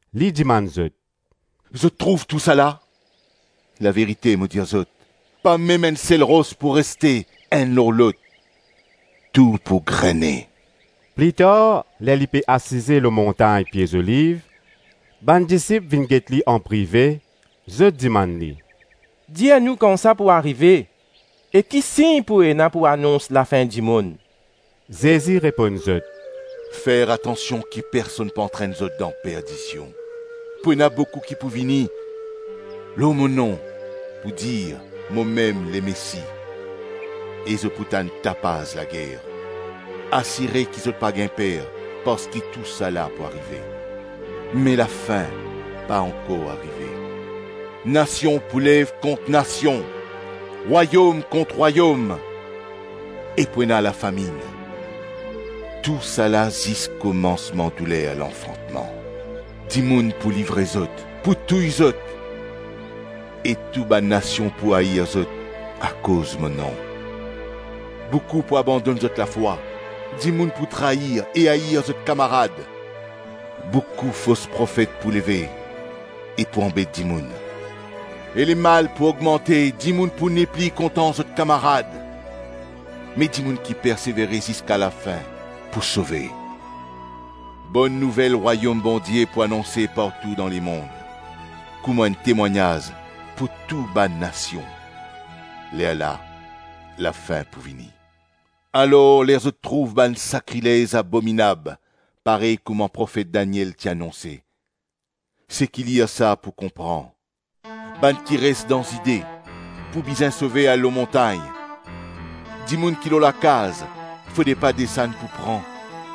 Li dimann zot, “Zot trouv tousala? Laverite, mo dir zot, pa mem enn sel ros pou reste enn lor lot; tou pou grene.” Plitar ler li pe asize lor montagn Pie Zoliv, bann disip vinn get li anprive, zot dimann li, “Dir nou kan sa pou arive, e ki sign pou ena pou anons lafin-dimonn.” Zezi reponn zot, “Fer atansion ki personn pa antrenn zot dan perdision Pou ena boukou ki pou vini lor mo nom pou dir ‘Momem Lemesi!’ E zot pou tann tapaz lager; asire ki zot pa gagn per, parski tousala pou arive, me lafin pa ankor arive. Nasion pou lev kont nasion, rwayom kont rwayom, e pou ena lafaminn. Tousala zis komansman douler lanfantman. Dimoun pou livre zot, pou touy zot e tou bann nasion pou air zot akoz mo nom. Boukou pou abandonn zot lafwa, dimoun pou trayir e air zot kamarad. Boukou fos profet pou leve e pou anbet dimoun. E lemal pou ogmante, dimoun pou nepli kontan zot kamarad. Me dimoun ki persevere ziska lafin pou sove. Bonn Nouvel Rwayom Bondie pou anonse partou dan lemonn, kouma enn temwagnaz pou tou bann nasion; lerla lafin pou vini. “Alor ler zot trouv bann sakrilez abominab parey kouma Profet Daniel ti anonse - seki lir sa pou konpran! - bann ki res dan Zide pou bizin sove al lor montagn, dimoun ki lor lakaz fode pa desann pou pran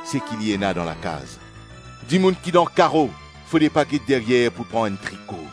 seki li ena dan lakaz, dimoun ki dan karo fode pa get deryer pou pran enn triko.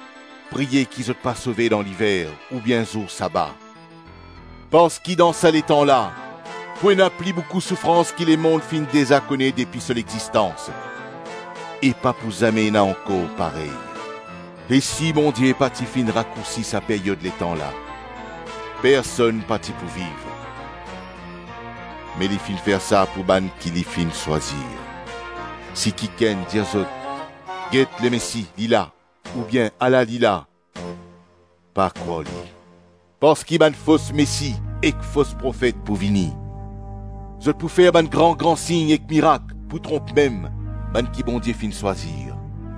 Priye ki zot pa sove dan liver oubien zour saba. Parski dan sa letan la pou ena pli boukou soufrans ki lemonn finn deza kone depi so lexistans, e pa pou zame ena ankor parey. E si Bondie pa ti finn rakoursi sa peryod letan la, personn pa ti pou viv. Me li finn fer sa pou bann ki li finn swazir. Si kikenn dir zot, ‘Get Lemesi, li la!’ oubien ‘Ala li la.’ Pa krwar li. Parski bann fos mesi ek fos profet pou vini; zot pou fer bann gran-gran sign ek mirak pou tronp mem bann ki Bondie finn swazir.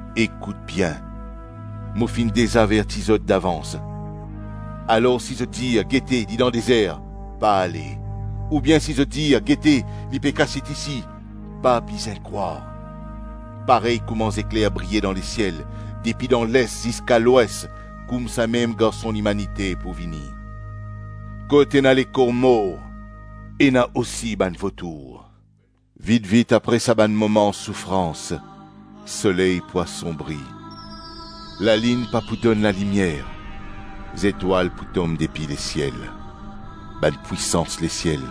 Ekout bien! Mo finn deza averti zot davans. Alor, si zot dir, ‘Gete, li dan dezer,’ pa ale. Oubien si zot dir, ‘Gete, li pe kasiet isi,’ pa bizin krwar. Parey kouma zekler briye dan lesiel depi dan les ziska lwes, koumsamem Garson Limanite pou vini. Kot ena lekor mor, ena osi bann votour. Vit-vit apre sa bann moman soufrans, soley pou asonbri lalinn pa pou donn lalimier zetwal pou tom depi lesiel bann pwisans lesiel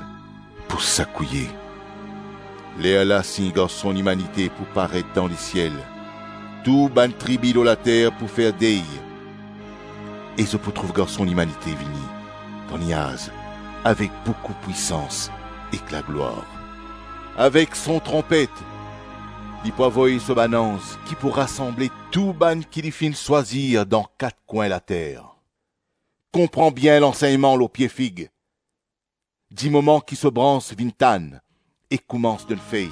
pou sakouye. Lerla sign Garson Limanite pou paret dan lesiel; tou bann tribi lor later pou fer dey e zot pou trouv Garson Limanite vini dan niaz avek boukou pwisans ek laglwar. Avek son tronpet, li pou avoy so bann anz ki pou rasanble tou bann ki li finn swazir dan kat kwin later.” “Konpran bien lansegnman lor pie fig; dimoman ki so brans vinn tann e koumans donn fey,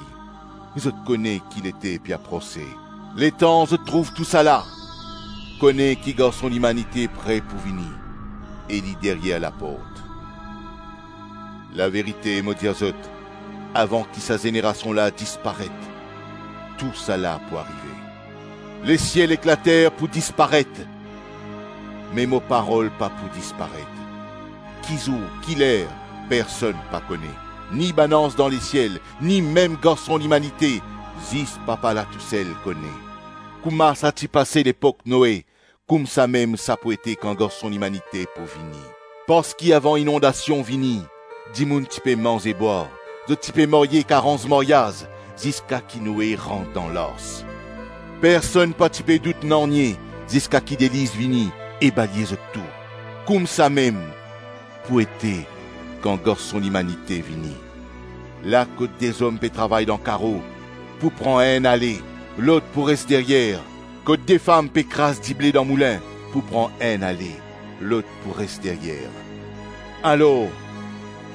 zot kone ki lete pe aprose. Letan zot trouv tousala, kone ki Garson Limanite pre pou vini e li deryer laport. Laverite mo dir zot, avan ki sa zenerasion la disparet, tousala pou arive. Lesiel ek later pou disparet me mo parol pa pou disparet. Ki zour, ki ler, personn pa kone, ni bann anz dan lesiel, ni mem Garson Limanite, zis papa la tousel kone. Kouma sa ti pase lepok Noe, koumsamem sa pou ete kan Garson Limanite pou vini. Parski avan inondasion vini, dimoun ti pe manze-bwar, zot ti pe marye ek aranz maryaz, ziska ki Noe rant dan lars. Personn pa ti pe dout nanye ziska ki deliz vini e balye zot tou. Koumsamem pou ete kan Garson Limanite vini. La kot de zom pe travay dan karo, pou pran enn ale, lot pou res deryer. Kot de fam pe kraz dible dan moulin, pou pran enn ale, lot pou res deryer. Alor,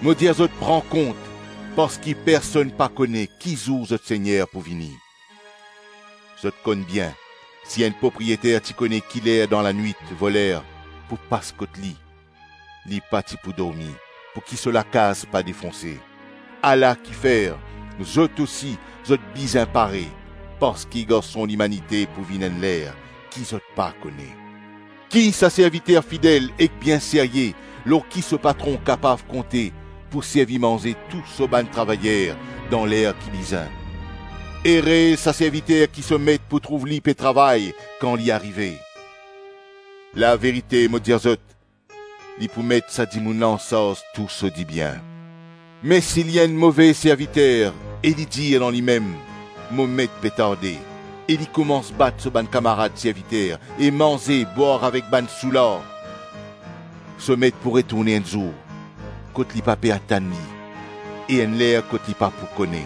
mo dir zot pran kont, parski personn pa kone ki zour zot Segner pou vini. Zot konn bien, si enn propriyeter ti kone ki ler dan lanwit voler pou pas kot li, li pa ti pou dormi pouki so lakaz pa defonse. Ala kifer, zot osi, zot bizin pare, parski Garson Limanite pou vinn enn ler ki zot pa kone.” “Ki sa serviter fidel ek bien serye, lor ki so patron kapav konte pou servi manze tou so bann travayer dan ler ki bizin? Ere sa serviter ki so met pou trouv li pe travay kan li arive. Laverite mo dir zot, li pou met sa dimoun la ansarz tou so dibien. Me si li enn move serviter e li dir dan limem, ‘Mo met pe tarde,’ e li koumans bat so bann kamarad serviter, e manze, bwar avek bann soular. So met pou retourne enn zour kot li pa pe atann li e enn ler kot li pa pou kone.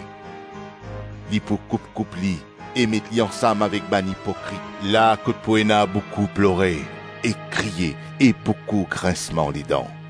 Li pou koup-koup li, e met li ansam avek bann ipokrit, la kot pou ena boukou plore ek kriye e boukou grinsman ledan.”